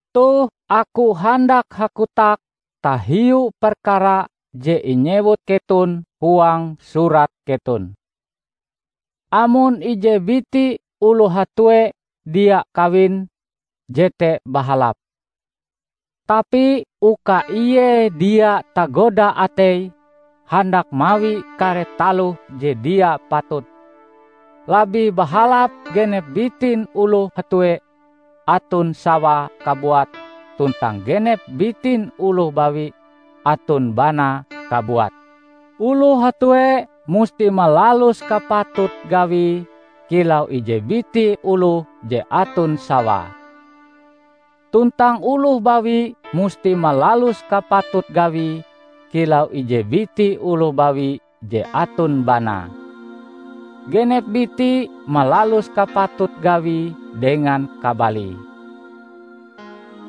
Toh aku handak hakotak tahiu perkara je inyewut keton huang surat keton. Amon ije biti oloh hatue dia kawin, jete bahalap. Tapi uka ie dia tagoda ateie handak mawi kare taloh je dia patut, labih bahalap genep bitin oloh hatue aton sawae kabuat tuntang genep bitin oloh bawi aton banae kabuat. Oloh hatue musti malalus kapatut gawie kilau ije biti oloh je aton sawae, tuntang oloh bawi musti malalus kapatut gawie kilau ije biti oloh bawi je aton banae; genep biti malalus kapatut gawie dengan kabalie.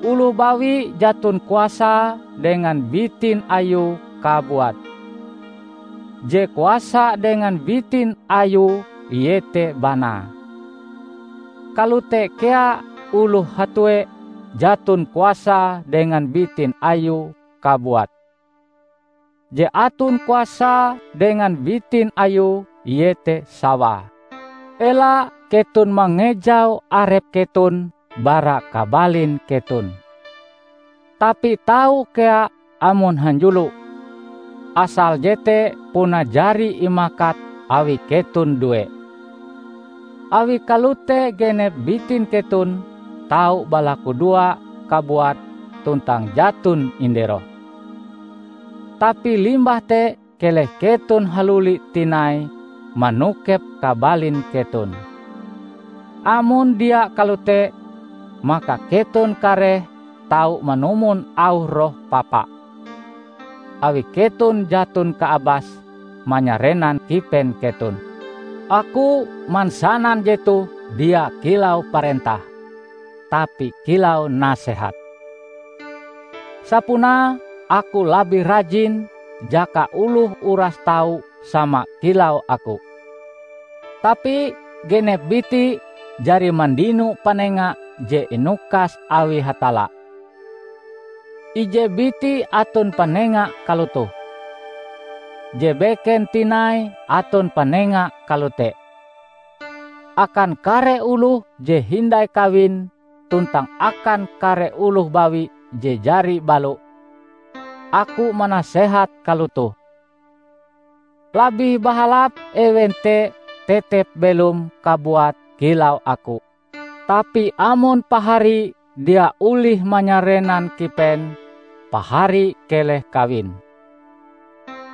Oloh bawi jaton kuasae dengan bitin ayue kabuat; je kuasa dengan bitin ayue iete banae. Kalote kea oloh hatue jaton kuasae dengan bitin ayue kabuat; je aton kuasae dengan bitin ayue iete sawae. Ela keton mangejau arep keton bara kabalin keton. Tapi tau kea amon hanjulo asal jete puna jari imakat awi keton due. Awi kalote genep bitin keton tau balakudoa kabuat tuntang jaton inderoh. Tapi limbah te keleh keton haluli tinai manokep kabalin keton. Amon dia kalote, maka keton kareh tau manumon auh roh papa, awi keton jaton kaabas manyarenan kipen keton. Aku mansanan jetoh dia kilau parentah, tapi kilau nasehat. Sapunae aku labih rajin jaka oloh uras tau sama kilau aku. Tapi genep biti jari mandino panenga je inukas awi Hatalla. Ije biti aton panenga kalotoh, je beken tinai aton panenga kalote. Akan kare oloh je hindai kawin tuntang akan kare oloh bawi je jari balo, aku manasehat kalotoh: labih bahalap ewen te tetep belom kabuat kilau aku. Tapi amon pahari dia olih manyarenan kipen, pahari keleh kawin.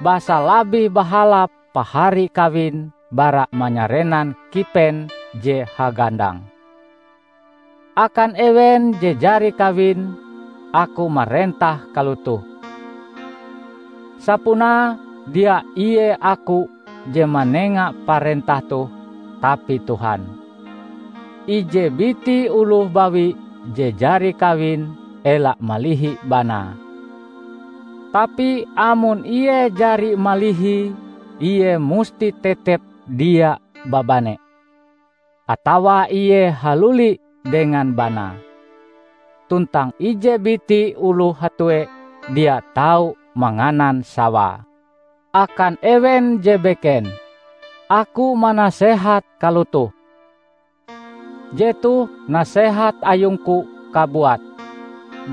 Basa labih bahalap pahari kawin bara manyarenan kipen je hagandang. Akan ewen je jari kawin, aku marentah kalotoh: (Sapunae dia ie aku je manenga parentah toh tapi Tuhan.) Ije biti oloh bawi je jari kawin ela malihi banae. Tapi amon ie jari malihie, ie musti tetep dia babane, atawa ie haluli dengan banae. Tuntang ije biti oloh hatue dia tau manganan sawae. Akan ewen je beken, aku manasehat kalotoh: -- Jetoh nasehat ayungku kabuat,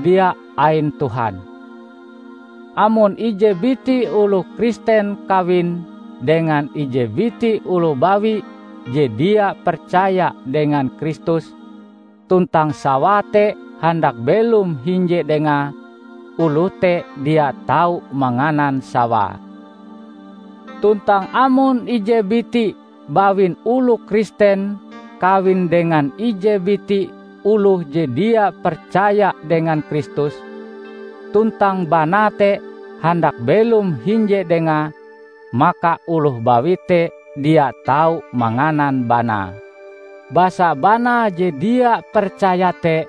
dia ain Tuhan -- amon ije biti oloh Kristen kawin dengan ije biti oloh bawi je dia percaya dengan Kristus, tuntang sawae te handak belom hinje dengae, oloh te dia tau manganan sawae. Tuntang amon ije biti bawin oloh Kristen kawin dengan ije biti oloh je dia percaya dengan Kristus, tuntang banae te handak belom hinje dengae, maka oloh bawi te dia tau manganan banae. Basa banae je dia percaya te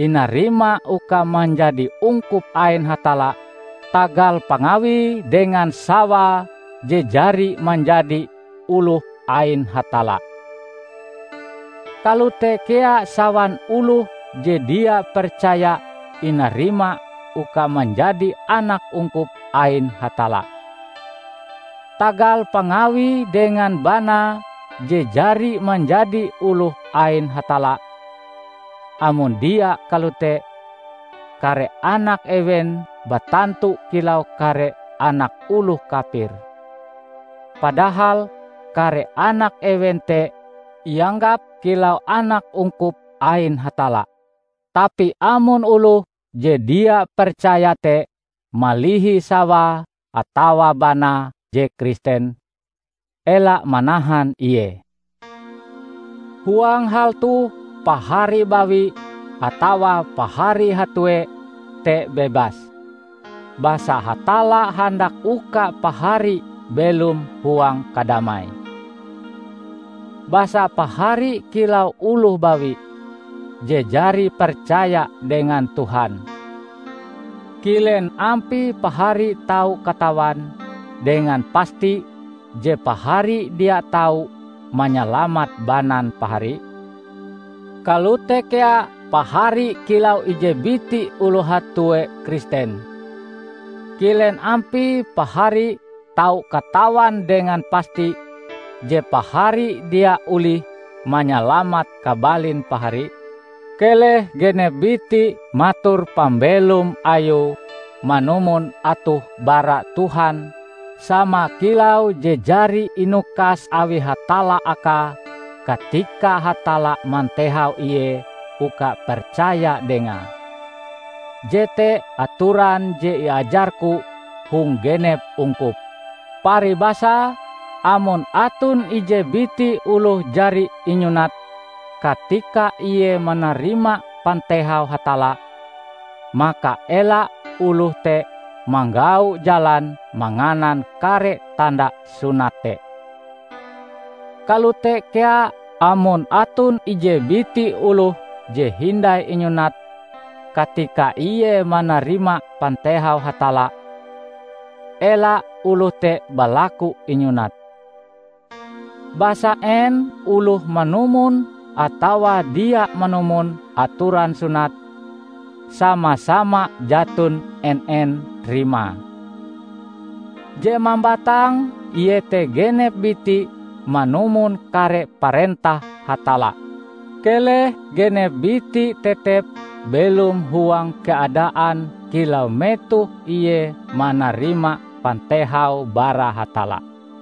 inarima uka manjadi ungkup ain Hatalla tagal pangawie dengan sawae je jari manjadi oloh ain Hatalla. Kalote kea sawan oloh je dia percaya inarima uka manjadi anak ungkup ain Hatalla, tagal pangawie dengan banae je jari manjadi oloh ain Hatalla. Amon dia kalote, kare anak ewen batantu kilau kare anak oloh kapir, padahal kare anak ewen te ianggap kilau anak ungkup ain Hatalla. Tapi amon oloh je dia percaya te malihi sawae atawa banae je Kristen, ela manahan ie. Huang hal toh pahari bawi atawa pahari hatue te bebas, basa Hatalla handak uka pahari belom huang kadamai. Basa pahari kilau oloh bawi -- je jari percaya dengan Tuhan -- kilen ampie pahari tau katawan dengan pasti je pahari dia tau manyalamat banan pahari? Kalote kea pahari kilau ije biti oloh hatue Kristen, kilen ampie pahari tau katawan dengan pasti je pahari dia olih manyalamat kabalin pahari? Keleh genep biti mator pambelom ayue manumon atoh bara Tuhan sama kilau je jari inukas awi Hatalla akae katika Hatalla mantehau ie uka percaya Dengae. Jete atoran je iajarku hong genep ungkup. Paribasae, amon aton ije biti oloh jari inyunat katika ie manarima pantehau Hatalla, maka ela oloh te manggau jalan manganan kare tanda sunat te. Kalote kea amon aton ije biti oloh je hindai inyunat katika ie manarima pantehau Hatalla, ela oloh te balaku inyunat. Basa en oloh manumon atawa dia manumon atoran sunat, sama-sama jaton en-en rimae. Je mambatang iete genep biti manumon kare parentah Hatalla. Keleh genep biti tetep belom huang keadaan kilau metoh ie manarima pantehau bara Hatalla.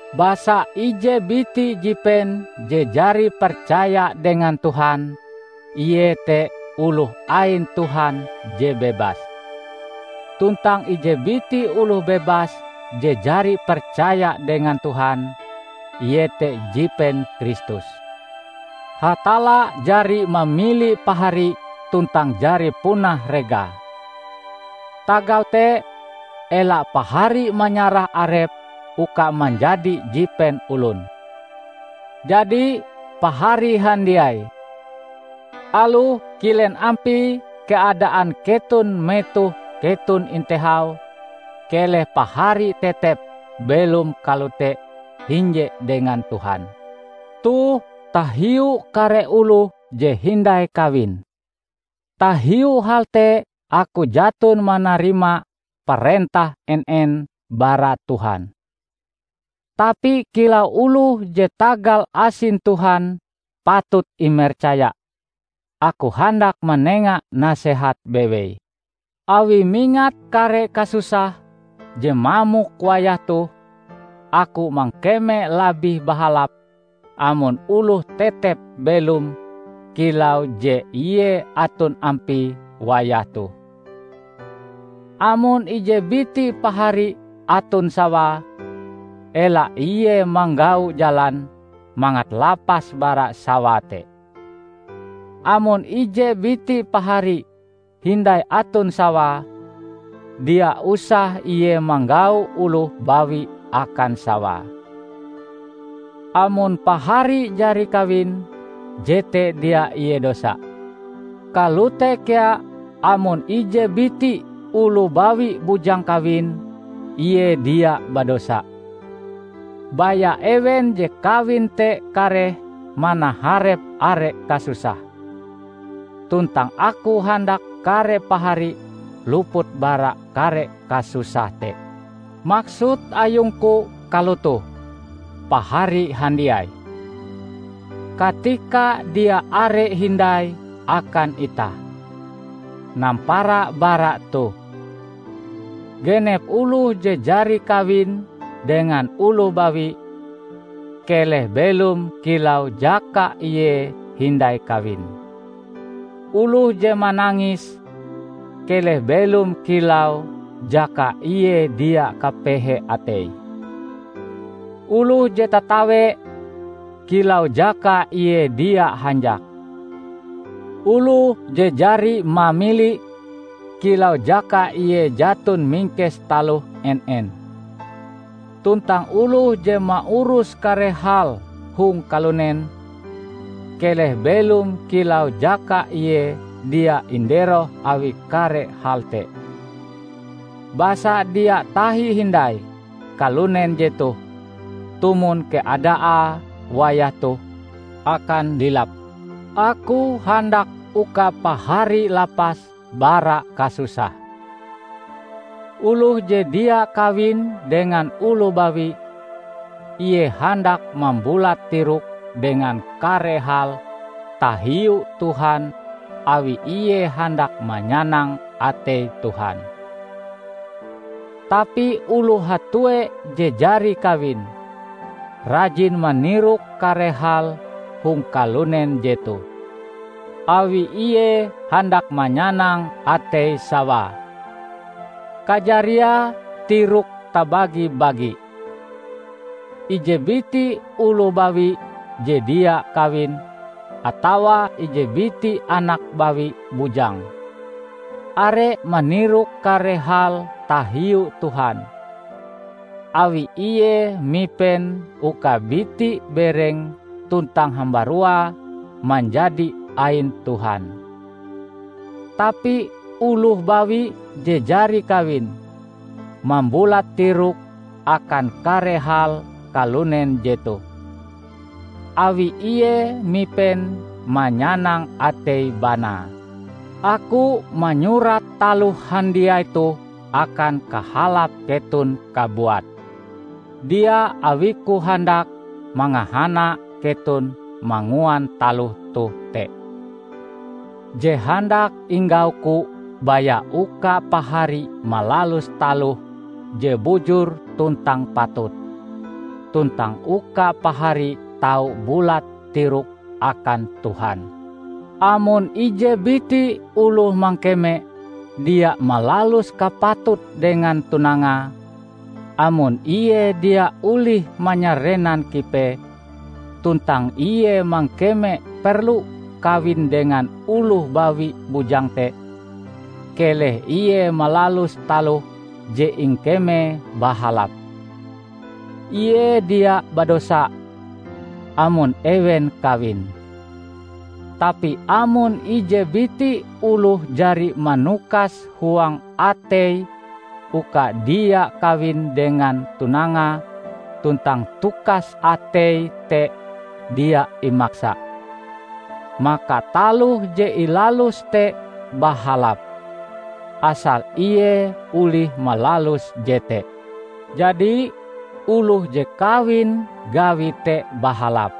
Basa ije biti jipen je jari percaya dengan Tuhan, ie te oloh ain Tuhan je bebas. Tuntang ije biti oloh bebas je jari percaya dengan Tuhan, ie te jipen Kristus. Hatalla jari mamili pahari tuntang jari punah regae. Tagal te, ela pahari manyarah arep uka manjadi jipen olon. Jadi, pahari handiai, aloh kilen ampie keadaan keton metoh keton intehau, keleh pahari tetep belom kalote hinje dengan Tuhan. Toh tahiu kare oloh je hindai kawin. Tahiu hal te aku jaton manarima parentah en-en bara Tuhan. Tapi kilau oloh je tagal asin Tuhan patut imercaya, aku handak manenga nasehat bewei. Awi mingat kare kasusah je mamok wayah toh, aku mangkeme labih bahalap amon oloh tetep belom kilau je ie aton ampie wayah toh. Amon ije biti Pahari aton sawae, ela ie manggau jalan mangat lapas bara sawae te. Amon ije biti pahari hindai aton sawae, dia usah ie manggau oloh bawi akan sawae. Amon Pahari jari kawin, jete dia ie dosa. Kalote kea amon ije biti oloh bawi bujang kawin, ie dia badosa. Baya ewen je kawin te kareh manaharep are kasusah. Tuntang aku handak kare pahari luput bara kare kasusah te. Maksud ayungku kalotoh, pahari handiai: katika dia are hindai akan itah. Nampara bara toh, genep oloh je jari kawin dengan oloh bawi, keleh belom kilau jaka ie hindai kawin; oloh je manangis, keleh belom kilau jaka ie dia kapehe atei; oloh je tatawe, kilau jaka ie dia hanjak; oloh je jari mamili, kilau jaka ie jaton mingkes taloh en-en, tuntang oloh je maurus kare hal hong kalunen, keleh belom kilau jaka ie dia inderoh awi kare hal te. Basa dia tahi hindai kalunen jetoh, tumon keadaae wayah toh, akan lilap! Aku handak uka pahari lapas bara kasusah. Oloh je dia kawin dengan oloh bawi, ie handak mambulat tiroke dengan kare hal tahiu Tuhan awi ie handak manyanang atei Tuhan. Tapi oloh hatue je jari kawin, rajin manirok kare hal hong kalunen jetoh, awi ie handak manyanang atei sawae; kajariae tiroke tabagi-bagi. Ije biti oloh bawi je dia kawin, atawa ije biti anak bawi bujang, are manirok kare hal tahiu Tuhan, awi ie mipen uka biti-bereng tuntang hambaruae manjadi ain Tuhan. Tapi oloh bawi je jari kawin, mambulat tiroke akan kare hal kalunen jetoh, awi ie mipen manyanang atei banae. Aku manyurat taloh handiai toh akan kahalap keton kabuat, dia awiku handak mangahana keton manguan taloh toh te. Je handak inggauku baya uka pahari malalus taloh je bujur tuntang patut, tuntang uka pahari tau bulat tirok akan Tuhan. Amon ije biti oloh mangkeme dia malalus kapatute dengan tunangae, amon ie dia olih manyarenan kipee, tuntang ie mangkeme perlu kawin dengan oloh bawi bujang te, keleh ie malalus taloh je ingkemee bahalap. Ie dia badosa, amon ewen kawin. Tapi amon ije biti oloh jari manukas huang ateie uka dia kawin dengan tunangae tuntang tukas ateie te dia imaksa, maka taloh je ilaluse te bahalap, asal ie olih malalus jete. Jadi, oloh je kawin gawie te bahalap,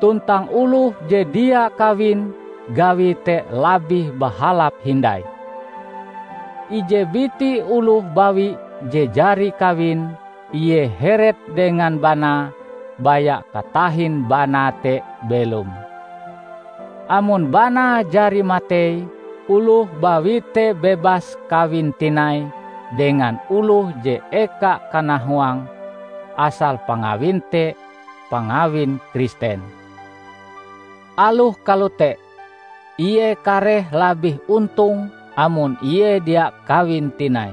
tuntang oloh je dia kawin gawie te labih bahalap hindai. Ije biti oloh bawi je jari kawin, ie heret dengan banae baya katahin banae te belom. Amon banae jari matei, oloh bawi te bebas kawin tinai dengan oloh je eka kanahuange; asal pangawin te pangawin Kristen. Aloh kalote, ie kareh labih ontong amon ie dia kawin tinai.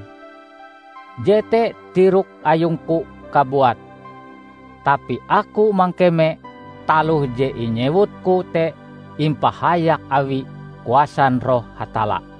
Jete tirok ayungku kabuat, tapi aku mangkeme taloh je inyewutku te impahayak awi kuasan Roh Hatalla.